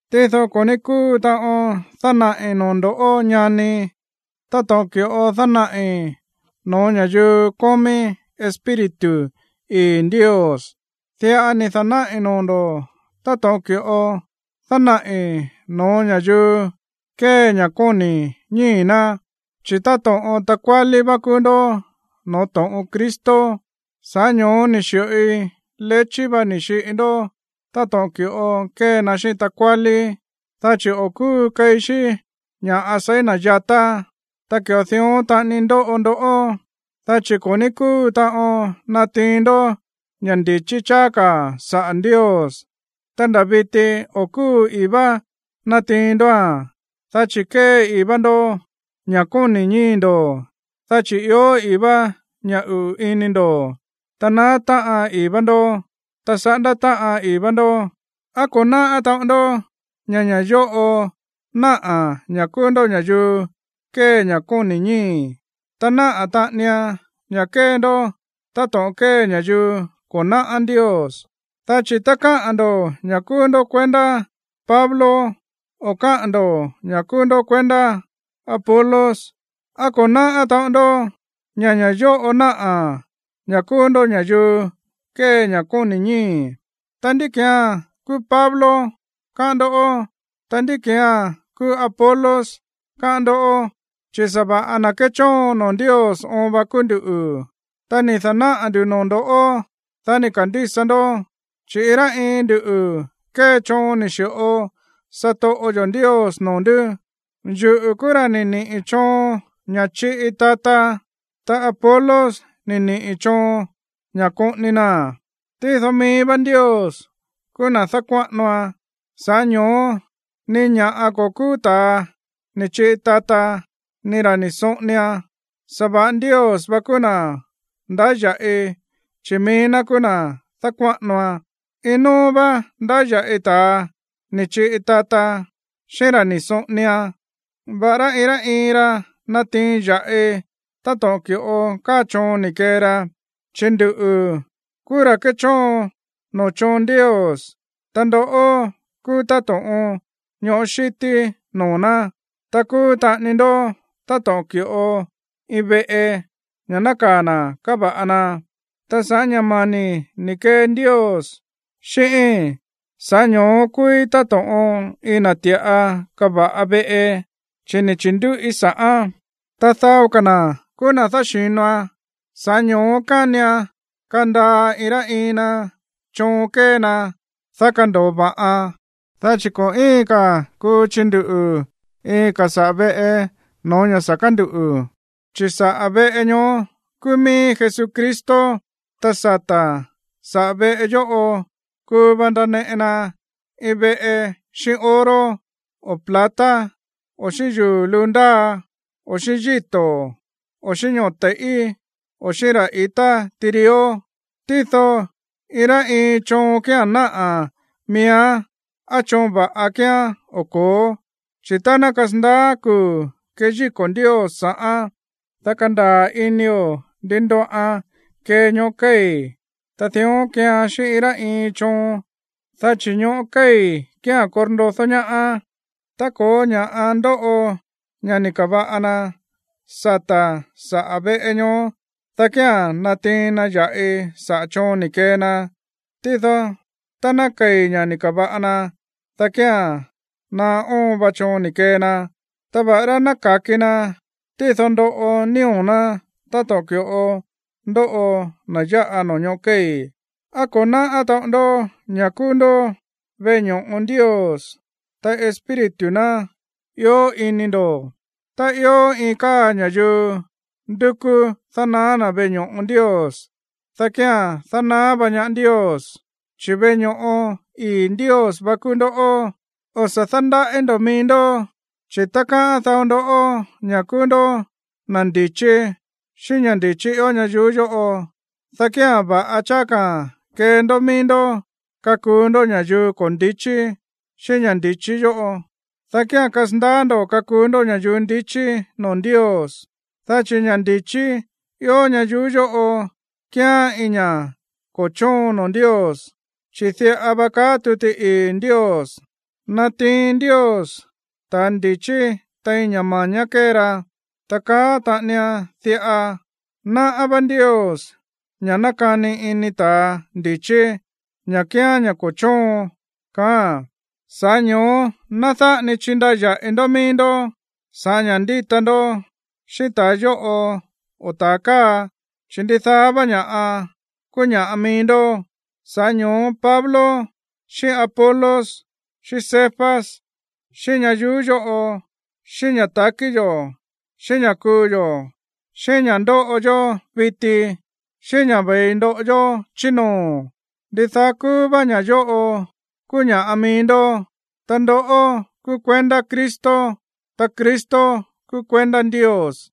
Tído ko̱ ní kúu taꞌon dánaꞌi̱ noo̱ ndo̱ꞌó, ñani, táto̱ꞌon ki̱ꞌo dánaꞌi̱ no̱ó ña̱yuu kómí Espíritu ii̱ Ndios. Diꞌa ni̱ da̱náꞌi̱ noo̱ ndo̱ táto̱ꞌon ki̱ꞌo dánaꞌi̱ no̱ó ña̱yuu kée ña̱ kóni̱ ñíi̱ ná, chi̱ táto̱ꞌon takuálí vá kúú ndó no̱ó to̱ꞌon Cristo. Sa̱ꞌá ño̱ó ni̱ xi̱ꞌoi lechí va ni̱ xiꞌi ndó táto̱ꞌon ki̱ꞌo kée na xíꞌín takuálí, dá chi̱ o̱ kúu keí xí ña̱ seí na̱ yatá. Ta ki̱ꞌo dión taꞌani ndóꞌo ndoꞌó, dá chi̱ ko̱ ní kúu taꞌon natiin ndó ña̱ ndi̱chí cháá ka̱ saꞌa̱ Ndios, ta nda̱ viti o̱ kúu ii̱ vá natiin ndóa̱n. Dá chi̱ kée ii̱ vá ndó ña̱ kóni̱ ñíi̱ ndo̱, dá chi̱ ió ii̱ vá ña̱ uꞌu̱ ini ndo̱, ta naá táꞌan ii̱ vá ndó, ta saꞌándá táꞌan ii̱ vá ndó. ¿Á ko̱ náꞌá taꞌon ndó ña̱ ña̱ yóꞌo náꞌa̱ ña̱ kúú ndó ña̱yuu kée ña̱ kóni̱ ñíi̱, ta náꞌa̱ taꞌanian ña̱ kée ndó táto̱ꞌon kée ña̱yuu ko̱ náꞌá Ndios? Dá chi̱ tá káꞌa̱n ndo̱ ña̱ kúú ndó kuendá Pablo, o káꞌa̱n ndo̱ ña̱ kúú ndó kuendá Apolos, ¿á ko̱ náꞌá taꞌon ndó ña̱ ña̱ yóꞌo náꞌa̱ ña̱ kúú ndó ña̱yuu kée ña̱ kóni̱ ñíi̱? Ta, ¿ndí ki̱án kúú Pablo, káꞌán ndó? Ta, ¿ndí ki̱án kúú Apolos, káꞌán ndó? Chi̱ sa̱va̱ꞌa na̱ kéchóon noo̱ Ndios oon va kúú nduꞌu̱, ta ni̱ da̱náꞌa̱ ndu̱ noo̱ ndo̱, dá ni̱ ka̱ndísa ndó. Chi̱ iin rá iin ndu kée choon ni̱ xi̱ꞌo satoꞌo yo̱ Ndios noo̱ ndú. Yuꞌu̱ kúú ra̱ ni̱ niꞌi̱ choon ña̱ chiꞌi tata, ta Apolos ni̱ niꞌi̱ choon ña̱ koꞌoni naa̱n. Tído mií vá Ndios kúú na̱ dákuáꞌanoan. Sa̱ꞌá ño̱ó ni ña̱ꞌa ko̱ kúú ta̱a ni̱ chiꞌi tata, ni ra̱ ni̱ soꞌonian, sa̱va̱ꞌa Ndios vá kúú na̱ ndáya̱ꞌi, chi̱ mií ná kúú na̱ dákuáꞌanoan. Iin nóó vá ndáya̱ꞌi ta̱a ni̱ chiꞌi tata, xíꞌín ra̱ ni̱ soꞌonian, va̱ꞌará iin rá iin ra nátiin ya̱ꞌi táto̱ꞌon ki̱ꞌo káa choon ni̱ kee ra. Chi̱ nduꞌu̱ kúú ra̱ kéchóon noo̱ choon Ndios, ta ndoꞌó kúú táto̱ꞌon ñoꞌó xíti noo̱ ná, ta kúú taꞌani ndó táto̱ꞌon ki̱ꞌo iin veꞌe, ña̱ nákaa̱ na̱ káva̱ꞌa na. Ta sa̱ꞌá ña̱ mani̱ ni̱ kee Ndios xíꞌíi̱n, sa̱ꞌá ño̱ó kúúí táto̱ꞌon iin na̱ ti̱ꞌa kava̱ꞌa veꞌe, chi̱ ni̱ chi̱ndúꞌí sa̱ꞌán. Ta dao ka̱ na̱ kúú na̱ dáxi̱noan. Sa̱ꞌá ño̱ó kánian kandaa iin rá iin na choon kée na, dá kando̱o va̱ꞌan. Dá chi̱ ko̱ íin ka̱ kuu chinduꞌu̱ iin ka̱ saꞌa̱ veꞌe no̱ó ña̱ sa̱ kánduꞌu̱, chi̱ saꞌa̱ veꞌe ñoó kúú mií Jesucristo. Ta sata̱ saꞌa̱ veꞌe yóꞌo kuu va ndaneꞌe na iin veꞌe xíꞌín oro, o plata, o xíꞌín yuu̱ luu ndáa, o xíꞌín yíto̱, o xíꞌín ñoo̱ te̱i̱ꞌí, o xíꞌín ra̱ i̱tá tirió. Tído iin rá iin choon kía̱n náꞌa̱ miíán á choon va̱ꞌa kíán o ko̱ó. Chi̱ tá ná kasandaá kuu̱ keyíko̱ Ndios sa̱ꞌán, dá kandaa̱ inio̱ ndi ndoꞌan kee ñoꞌó kéi̱. Ta dión keean xíꞌín iin rá iin choon, dá chi̱ ñoꞌó kéi̱ kía̱n korndodó ñaá. Tá ko̱ó ña̱ꞌa ndoꞌo ña̱ ni̱ ka̱va̱ꞌa na sata̱ saꞌa̱ veꞌe ñoó, dá kía̱n natiin na ya̱ꞌi saꞌa̱ choon ni̱ kee na. Tído tá ná kei̱ ña̱ ni̱ ka̱va̱ꞌa na, dá kía̱n naá óon va choon ni̱ kee na. Ta va̱ꞌará ná ka̱ki na, tído ndoꞌo nío̱ ná táto̱ꞌon ki̱ꞌo ndóꞌo na̱ yáꞌa noo̱ ñoꞌó kéi̱. ¿Á ko̱ náꞌá taꞌon ndoꞌó ña̱ kúú ndó veꞌe ño̱ꞌo Ndios, ta Espíritu ná ió ini ndo̱? Tá ió iin káa ña̱yuu ndúkú dánaá na̱ veꞌe ño̱ꞌo Ndios, dá kía̱n dánaá vá ñaá Ndios, chi̱ veꞌe ño̱ꞌo ii̱ Ndios vá kúú ndoꞌó. O̱ sa̱ dándaꞌí ndo̱ mií ndó, chi̱ tá káꞌán dao ndoꞌó ña̱ kúú ndó na̱ ndi̱chí xíꞌín ña̱ ndi̱chí ió ñayuú yóꞌo, dá kía̱n va̱ꞌa cháá ka̱ kee ndó mií ndó kakuu ndó ña̱yuu ko̱ ndi̱chí xíꞌín ña̱ ndi̱chí yóꞌo, dá kía̱n kasandaá ndo̱ kakuu ndó ña̱yuu ndichí noo̱ Ndios. Dá chi̱ ña̱ ndi̱chí ió ñayuú yóꞌo kíán iin ña̱ꞌa ko̱ chóon noo̱ Ndios. Chi̱ diꞌa va káꞌa̱n tuti ii̱ Ndios: “Nátiin Ndios ta̱ ndi̱chí tein ña̱ ma̱ñá kée ra.” Ta káꞌa̱n taꞌanian diꞌa: “Náꞌá vá Ndios ña̱ nákani ini ta̱ ndi̱chí, ña̱ kíán ña̱ ko̱ chóon”, kaáa̱n. Sa̱ꞌá ño̱ó ná dáꞌa ni chindaya̱ꞌi ndó mií ndó sa̱ꞌá ña̱ ndíta ndó xíꞌín ta̱a yóꞌo o ta̱a káa, chi̱ ndidaá vá ña̱ꞌa kúú ña̱ꞌa mií ndó. Sa̱ꞌá ño̱ó Pablo, xíꞌín Apolos, xíꞌín Cefas, xíꞌín ñayuú yóꞌo, xíꞌín ña̱ ta̱kí yo̱, xíꞌín ña̱ kuu yo̱, xíꞌín ña̱ ndóꞌo yó viti, xíꞌín ña̱ ve̱i ndoꞌo yó chí noo̱, ndidaá kúú vá ña̱ yóꞌo kúú ña̱ꞌa mií ndó. Ta ndoꞌó kúú kuendá Cristo, ta Cristo kúú kuendá Ndios.